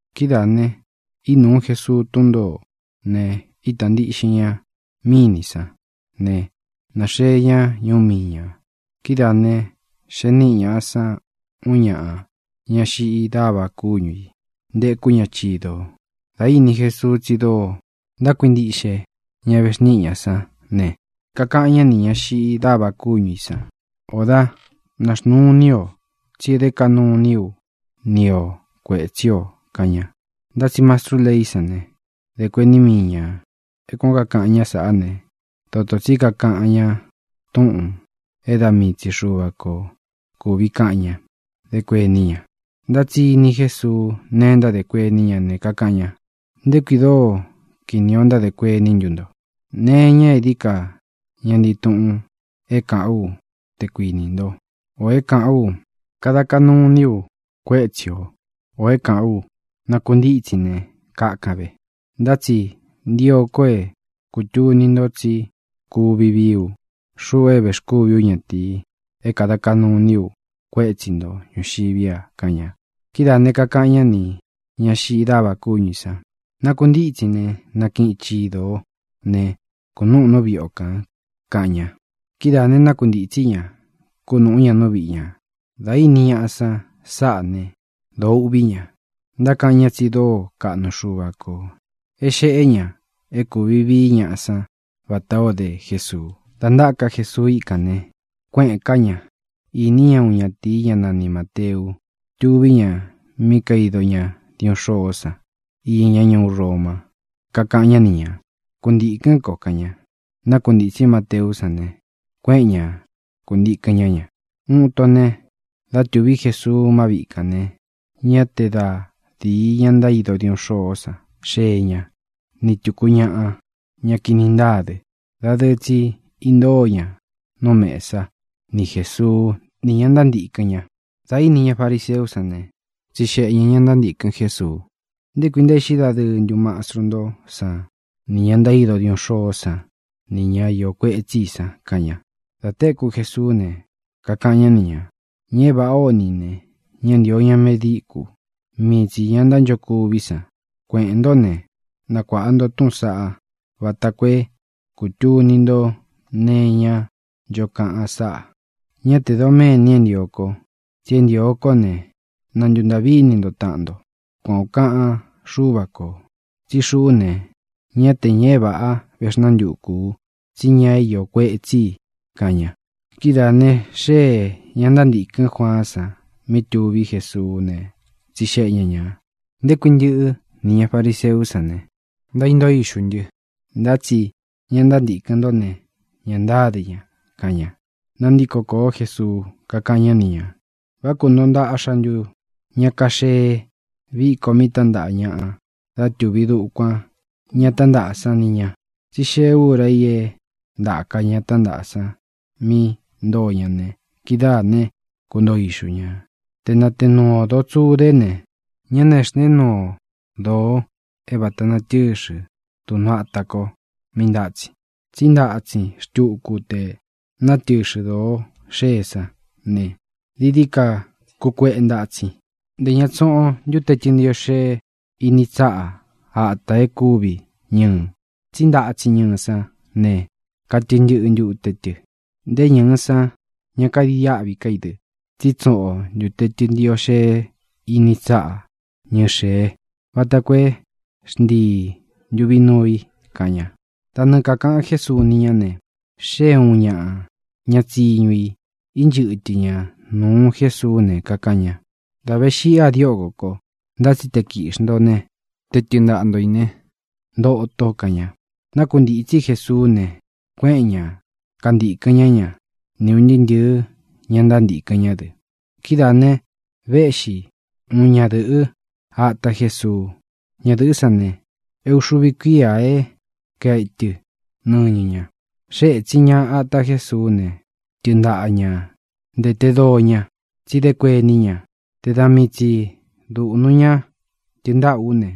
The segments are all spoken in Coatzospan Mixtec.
Kidáā ne, ínūu Jesuu tún ntōó ne, ítā ntiꞌxin ña mínī sán ne, náxee ña ñuú miī ña. Kidáā ne, xee níꞌi ñāꞌa san uun ñaꞌa, ñá xiꞌi dáva kúñu ī, ntekú ña chidō. Dā íni Jesuu tsi dóo ntákuintiꞌxe ña vexníꞌi ñā sán ne, kakaꞌan ñá nī ñá xiꞌi dáva kúñu ī san: —Ō dáꞌ, naxnuu ini o, tsí e dé kaꞌnu iní u ni ō kuétsi ō —kaꞌan ña. Ntá tsi mastrú leí san ne, dē kuení mii ñā: “É kuān ó kakaꞌan ñá sāꞌá ne, dotō tsí kakaꞌan ña túꞌūn é da mii tsi Xuva ko kūvi kaꞌan ña”, dé kuení ña. Ntá tsi ini Jésuu neé ntádē kuení ña, ne, kakaꞌan ña: —¿Nté kui dóo kīni o ntádē kuení ntu nto? ¿Nee iña é dií ka ña ntii tuꞌun é kāꞌán u, te kuinī ntó, ō é kāꞌán u: “Kada ntaa kaꞌnu iní u kuétsi ō”, ō é kāꞌán u: “Nakuntítsin ne, kakan ve”? Ntá tsi ntio ko é kūtuni nto tsí kuvi vií u, xuꞌu é vēxkúvi ú ñatīi, é kāda kaꞌnu iní u kuétsi ntō ñuxiví a —kaꞌan ña. Kidáā ne, kakaꞌan ñá nī ñá xiꞌi dáva kúñu ī san: —¡Nakuntítsin ne, nakiꞌin chido ō né, kūnúꞌun nú viꞌi o kān! —kaꞌan ña. Kidáā ne, nákuntītsí ña, kunúꞌu ña nú viꞌi ñā. Dā íni ñaꞌa san sáꞌā né, dōo uꞌví ña. Ntákaꞌan ña tsi dóo kaꞌnu Xuva kō é xēꞌé ña é kūvi vií ñaꞌa san vatā o dé Jesuu. Dā ntáka Jesuu íkān ne, kuéꞌēn ká ña. Īní ña uun ñatīi, ñá nani Māteu. Tuví ña mí kaido ña diuꞌun xôó san iña ñá ñuú Roma. Kakaꞌan ñá ni ñā: —Kuntīkɨ́n ko —kaꞌan ña. Nákuntītsí Mateú san ne, kuéꞌen ña kūntikɨn ñá ña. Uun ito ne, dá tuví Jesuu má viꞌi kān ne, ñá te da dīi ña ntaído diuꞌun xôó san xee ña, ni tuku ñaꞌa, ña kini ntáa dɨ. Dadɨɨ tsi intóo ña nú mēsa ni Jésuu ni ña ntántīkɨn ña. Dā íni ña fariseú san ne, tsixeꞌe ñā ña ntántīkɨn Jésuu: —¿Nté kui ntaéꞌxi dadɨɨ ntú mastru ntó san nī ña ntaído diuꞌun xôó san ni ña iō kuetsí i san? —kaꞌan ña. Dā téku Jesuú ne, kakaꞌan ñá ni ñā: —Ña é vāꞌá o ni ī ne, ña ntántio ña medíkū; mii tsī ña ntánchokuví san. Kueꞌēn ntó ne, nakuāꞌa nto túꞌūn saꞌa, vata koo é kūtuni nto nee iñá ncho kaꞌan sáꞌā: “Ñá tē doméni é ntio ko, tsi é ntīo kó ne, na ntūntaꞌví ini nto taꞌan nto.” Kuan ō kaꞌan Xúva kō. Tsí xuꞌú ne, ñá te ñaꞌa é vāꞌa véxnantuku ú, tsí ñaꞌa é iō kuetsí i —kaꞌan ña. Kidáā ne, xéē ña ntántīkɨ́n Juaán san mí tuví Jesuú ne, tsixeꞌe ña ñā: —¿Nté kui ntɨꞌɨ́ nī ña fariseú san ne, ntaíntóo ixū ntɨ, ntá tsi ña ntántīkɨn ntó ne, ña ntáde ña? —kaꞌan ña. Nantíko kōó Jesuu, kakáꞌan ñá ni ñā: —¿Vá kuntoo ntaꞌxa ntu ña kaxee viko mí tántaꞌa ñaꞌa dá tuví dukuān ña tántaꞌa san ni ñā? Tsi xée ūra i é ntāka ña tántaꞌa san mí ntōo ña ne, kidáā né, kuntoo ixu ñā. ʼTe nāteé nuu ō doo tsudé ne, ñá nāxnteé nuu o doo é vāta natɨ́xɨ̄ duꞌnu áta kō mí ntátsin, tsí ntatsin xtuku te natɨxɨ̄ doo xée sán ne, dií dií ka kukueꞌe ntatsin. Ntē ña tsuꞌun o ntute tɨ́ntiꞌo xee ini tsáꞌa atā e kúvi ñɨɨ, tsí ntatsin ñɨɨ sán ne, katɨ ntɨꞌɨ ntute tɨ. Nté ñɨ̄ɨ san ña kaidiáꞌvi ká i dɨ. Tsí tsuꞌun o ntūte tɨntiꞌo xee ini tsáꞌa ñɨɨ xēé, vata koo é xntii ntuvi nuu i —kaꞌan ña. Da nɨɨ kākaꞌan Jésuu ni ñá ne, xée ūun ñaꞌa ña tsiñu i, inchɨ́tɨ ña nūu Jésuú ne, kakaꞌan ña: —Dā ve xíꞌi a diókō ko. Ntá tsi te kīꞌxi nto ne, te tɨɨn ntaꞌa nto ī né, ntoto —kaꞌan ña. Nákuntītsí Jesuú ne, kuéꞌen ñā kántīkɨn ñá ña, ni ūn ntɨɨ́ ntɨ̄ɨ́ ña ntántīkɨn ñá dɨ. Kidáā ne, véꞌxi uun ñadɨ̄ꞌɨ́ ata Jesuu. Ñadɨ̄ꞌɨ́ san ne, é ūxuvi kuía é kaetɨ nɨñɨ ña. Xée ētsin ña ata Jésuú ne, tɨɨn ntaꞌa ña ntēte doo ña. Tsí dé kuení ña: “Te da mii tsi dūꞌnu ña tɨɨn ntáꞌa ú ne,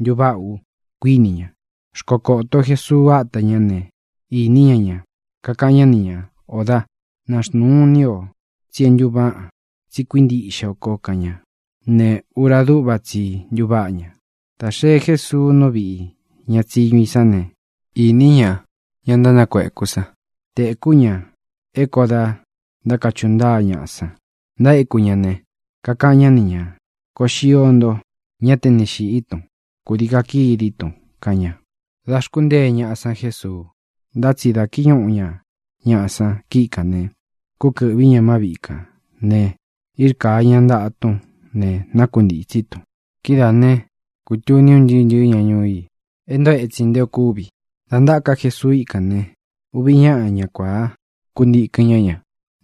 ntuváꞌa u”, kuini ña. Xkokōto Jésuu áta ñā ne, īní ña ña. Kakaꞌan ñá ni ñā: —Ō dáꞌ, naxnuu ini o, tsi é ntuváꞌan, tsi kuíntiꞌxe o ko —kaꞌan ña. Ne, ura dúꞌva tsi i ntuváꞌa ña. Dā xee Jésuu nú viꞌī ña tsiñu i sán ne, īni ña ña ntánakueku san; tēkú ña é kō da ntákachuꞌu ntáa ñaꞌa san ntaéku ña ne, kakaꞌan ñá ni ñā: —Koo xio nto. Ñá te ni xīꞌí tun; kūdii kakidí tun —kaꞌan ña. Da xkuntée ñaꞌa san Jesuu. Ntá tsi dā kíñuꞌu ña ñaꞌa san kíꞌi kān ne, kúkɨ̄ꞌví ña má viꞌi kān ne, írkāa ña ntaꞌa tún ne, nákuntītsí tun. Kidáā né, kūtuní un ntɨɨ́ ntɨ̄ɨ́ ña ñuú i é ntoo etsin nté ō kúvi. Dā ntáka Jesuu íkān ne, uvi ñáꞌa, ña kuāá, kuntīkɨn ñá ña,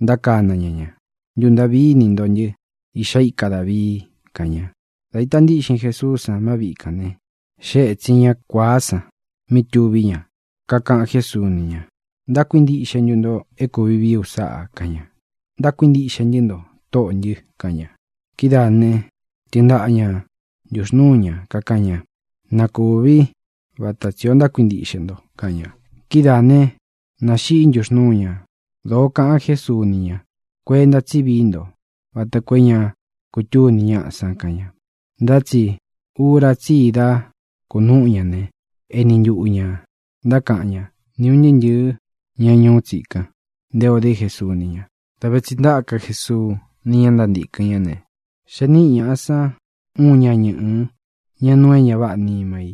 ntákana ña ña: —¡Ntūntaꞌví ini nto ntɨ́, Iꞌxá ika Dāvii! —kaꞌan ña. Dā ita ntíꞌxin Jesuú san má viꞌi kān ne, xée etsin ña kuāá san mí tuví ña. Kakaꞌan Jésuu ni ña: —¿Ntákuintiꞌxe ntu nto e kuvi vií u sáꞌā? —kaꞌan ña. —Ntákuintiꞌxe ntɨ́ nto, Tóꞌō ntɨ —kaꞌan ña. Kidáā ne, tɨɨn ntaꞌa ña ntuxnūu ñá, kakaꞌan ña: —Na kūví vata tsī ó ntákuintiꞌxe nto —kaꞌan ña. Kidáā né, nāxiꞌi ntuxnúu ña. Dōó kaꞌan Jésuu ni ña: —Kuenta tsí vií nto vata koo é ña kutúni ñáꞌa san —kaꞌan ña. Ntá tsi ura tsí i dá kunúꞌu ña ne, eni ntuꞌu ñā ntákaꞌan ñá ni ūn ntɨɨ́ ntɨ̄ɨ́ ña ñuú tsikan nté ō dé Jesuu ni ña. Dā ve tsi ntáka Jesuu ni ña ntántīkɨn ñá ne, xee níꞌi ñaꞌa san uun ña ñɨꞌɨ, ña nuu é ña váꞌā nima i.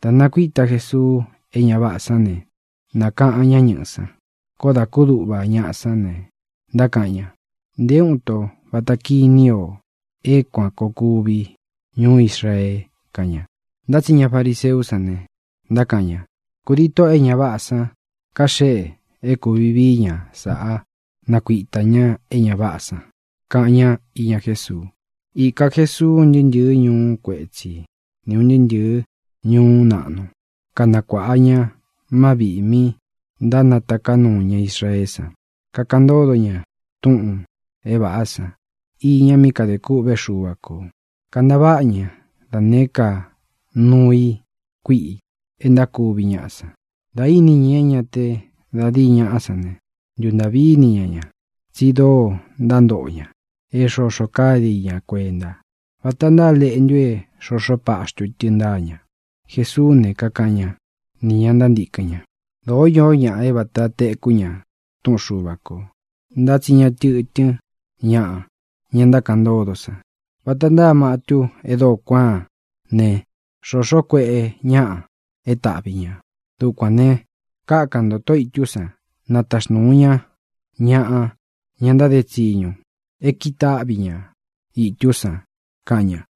Dā nakuíta Jesuu é ña váꞌā san ne, nākaꞌan ñá ñɨꞌɨ san. Koó dā kúduꞌva ñaꞌa sán ne, ntákaꞌan ña: —¡Nté uun ito vata kíni o é kuan koo kūvi ñuú Israee! —kaꞌan ña. Ntá tsi ña fariseú san ne, ntákaꞌan ña: —Kūdii tóꞌō e ña váꞌā san kaxeꞌe é kūvi vií ña sāꞌá nakuitā ñá é ña váꞌā san —kaꞌan ñá iña Jésuu. Īka Jesuu un ntɨɨ́ ntɨ̄ɨ́ ñuú kuetsi ni ūn ntɨɨ́ ntɨ̄ɨ́ ñuú naꞌnu, kanakuāꞌa ña má viꞌī mi ntánataká nuu ña Israeé san, kakaꞌan ntódo ña túꞌūn é vāꞌá san iña mí kadē kûꞌvé Xuva kō. Kantaváꞌa ña da nēé ka nuu i kuíꞌi e ntákuvi ñaꞌa san. Dā íni ña é ña te da díi ñaꞌá san ne, ntūntaꞌví ini ña ña tsi dóo ntántoꞌo ña é xoxo káde i ña kuenta. Vata ntáa leꞌntu é xoxo páxtu tɨ ntáa ña. Jesuú ne, kakaꞌan ñá nī ña ntántīkɨn ña: —Dōó iō ñáꞌa é vāta tekú ña túꞌun Xuva kō, ntá tsi ña tɨtɨ́n ñaꞌa ña ntákaꞌan ntódo san. Vata ntáa matu e dóo kuáan ne, xōxó kueꞌe ñáꞌa é taꞌvi ñā. Dukuān ne, kákan ntō Tóꞌo ītú san na taxnūu ña ñaꞌa, ña ntáde tsiñu, e kitáꞌvi ña ītú san —kaꞌan ña.